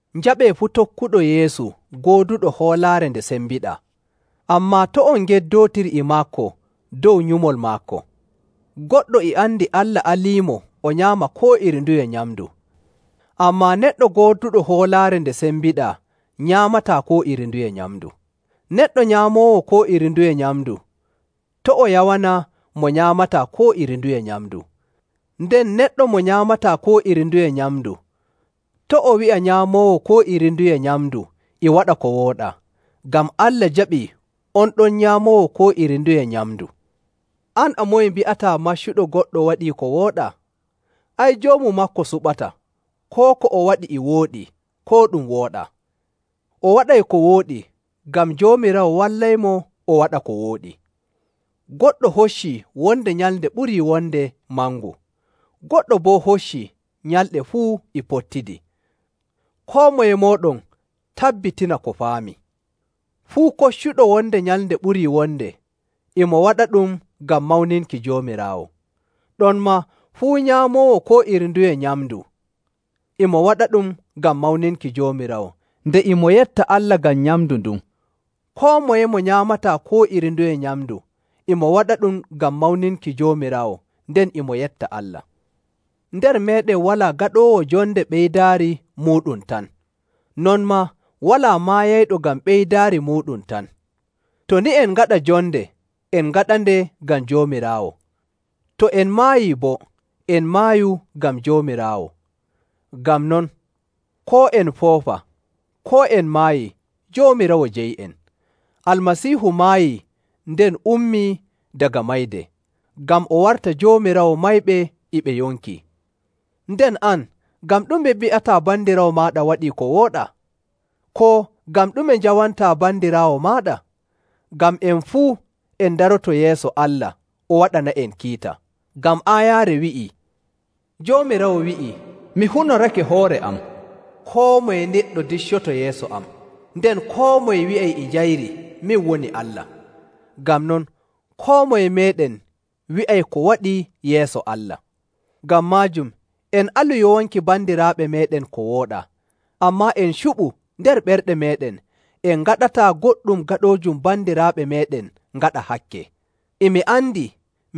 Njaɓee fuu tokkuɗo Yeesu gooduɗo hoolaare nde sembiɗaa, ammaa to' on ngeddootir e maako dow nyumol maako. Goɗɗo e andi Allah aliimo o nyaama koo iri nduye nyamndu, ammaa neɗɗo gooduɗo hoolaare nde sembiɗaa nyaamataa koo iri nduye nyamndu. Neɗɗo nyaamoowo koo iri nduye nyamndu, to' o yawana mo nyaamataa koo iri nduye nyamndu, nden neɗɗo mo nyaamataa koo iri nduye nyamndu to' o wi'a nyaamoowo koo iri nduye nyamndu e waɗa ko wooɗaa, ngam Allah jaɓii on ɗon nyaamoowo koo iri nduye nyamndu. An a moye mbi'ataa maccuɗo goɗɗo waɗii ko wooɗaa? Ay, Joomu maako suɓata koo ko o waɗi e wooɗi, koo ɗum wooɗaa. O waɗay ko wooɗi, ngam Joomiraawo wallaymo o waɗa ko wooɗi. Goɗɗo hoccii wonde nyalnde ɓurii wonde mangu, goɗɗo boo hoccii nyalɗe fuu e pottidi. Koo moye mooɗon tabbitina ko faami. Fuu koccuɗo wonde nyalnde ɓurii wonde, e mo waɗaɗum ngam mawninki Joomiraawo. Ɗonmaa fuu nyaamoowo koo iri nduye nyamndu, e mo waɗaɗum ngam mawninki Joomiraawo, nde e mo yetta Allah ngam nyamndu ndun. Koo moye mo nyaamataa koo iri nduye nyamndu, e mo waɗaɗum ngam mawninki Joomiraawo nden e mo yetta Allah. Nder meeɗen walaa gaɗoowo jonde ngam ɓeydaari muuɗum tan, non maa walaa maayayɗo ngam ɓeydaari muuɗum tan. To ni en ngaɗa jonde, en ngaɗande ngam Joomiraawo. To en maayi boo, en maayu ngam Joomiraawo. Ngam non, koo en foofa, koo en maayii, Joomiraawo jeyi'en. Almasiihu maayi nden ummii daga mayde, ngam o warta Joomiraawo mayɓe e ɓe yonki. Nden an, ngam ɗume mbi'ataa bandiraawo maaɗa waɗii ko wooɗaa? Koo, ngam ɗume njawantaa bandiraawo maaɗa? Ngam en fuu en ndaroto yeeso Allah o waɗana'en kiita. Ngam aayaare wi'ii, “Joomiraawo wi'ii, mi hunorake hoore am, koo moye neɗɗo diccoto yeeso am, nden koo moye wi'ay e njayri min woni Allah.” Ngam non, koo moye meeɗen wi'ay ko waɗi yeeso Allah. Ngam maajum, en alu yowanki bandiraaɓe meeɗen ko wooɗaa, ammaa en cuɓu nder ɓerɗe meeɗen en ngaɗataa goɗɗum gaɗoojum bandiraaɓe meeɗen ngaɗa hakke. E mi andi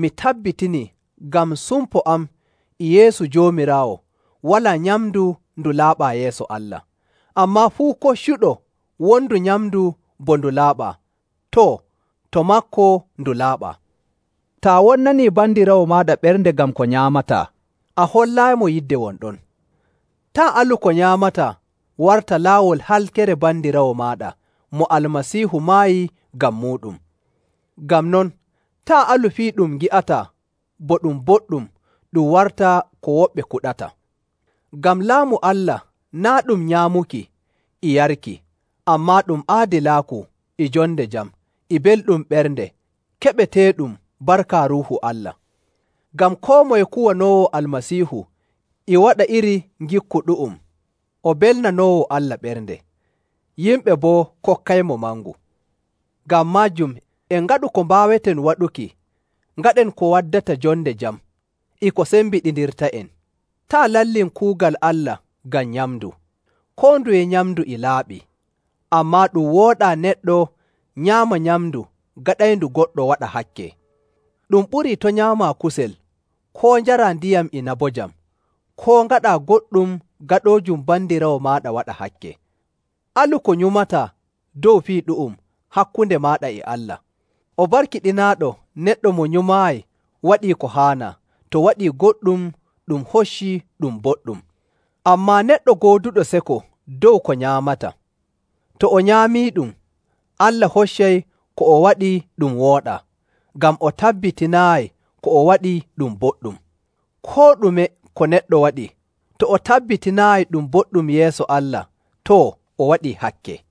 mi tabbitinii ngam sumpo am e Yeesu Joomiraawo, walaa nyamndu ndu laaɓaa yeeso Allah. Ammaa fuu koccuɗo wondu nyamndu bo ndu laaɓaa, too, to maako ndu laaɓaa. Taa wonnanii bandiraawo maaɗa ɓernde ngam ko nyaamataa, a hollaayimo yidde won ɗon. Taa' alu ko nyaamataa warta laawol halkere bandiraawo maaɗa mo Almasiihu maayi ngam muuɗum. Ngam non, taa' alu fii ɗum ngi'ataa bo ɗum boɗɗum ɗum warta ko woɓɓe kuɗata. Ngam Laamu Allah naa' ɗum nyaamuki e yarki, ammaa ɗum aadilaaku, e jonde jam, e belɗum ɓernde keɓeteeɗum barka Ruuhu Allah. Ngam koo moye kuwanoowo Almasiihu e waɗa iri ngikku ɗu'um o belnanoowo Allah ɓernde; yimɓe boo kokkaymo mangu. Ngam maajum, en ngaɗu ko mbaaweten waɗuki ngaɗen ko waddata jonde jam e ko sembiɗindirta'en. Taa' lallin kuugal Allah ngam nyamndu. Koo nduye nyamndu e laaɓi, ammaa ɗum wooɗaa neɗɗo nyaama nyamndu gaɗayndu goɗɗo waɗa hakke. Ɗum ɓurii to' nyaamaa kusel, koo njaraa ndiyam inabojam, koo ngaɗaa goɗɗum gaɗoojum bandiraawo maaɗa waɗa hakke. Alu ko nyumataa dow fii ɗu'um hakkunde maaɗa e Allah. O barkiɗinaaɗo neɗɗo mo nyumaayi waɗii ko haanaa, to waɗii goɗɗum ɗum hocci ɗum boɗɗum. Ammaa neɗɗo gooduɗo seko dow ko nyaamata, to o nyaamiiɗum, Allah hoccay ko o waɗi ɗum wooɗaa, ngam o tabbitinaayi ko o waɗi ɗum boɗɗum. Koo ɗume ko neɗɗo waɗi, to o tabbitinaayi ɗum boɗɗum yeeso Allah, too, o waɗii hakke.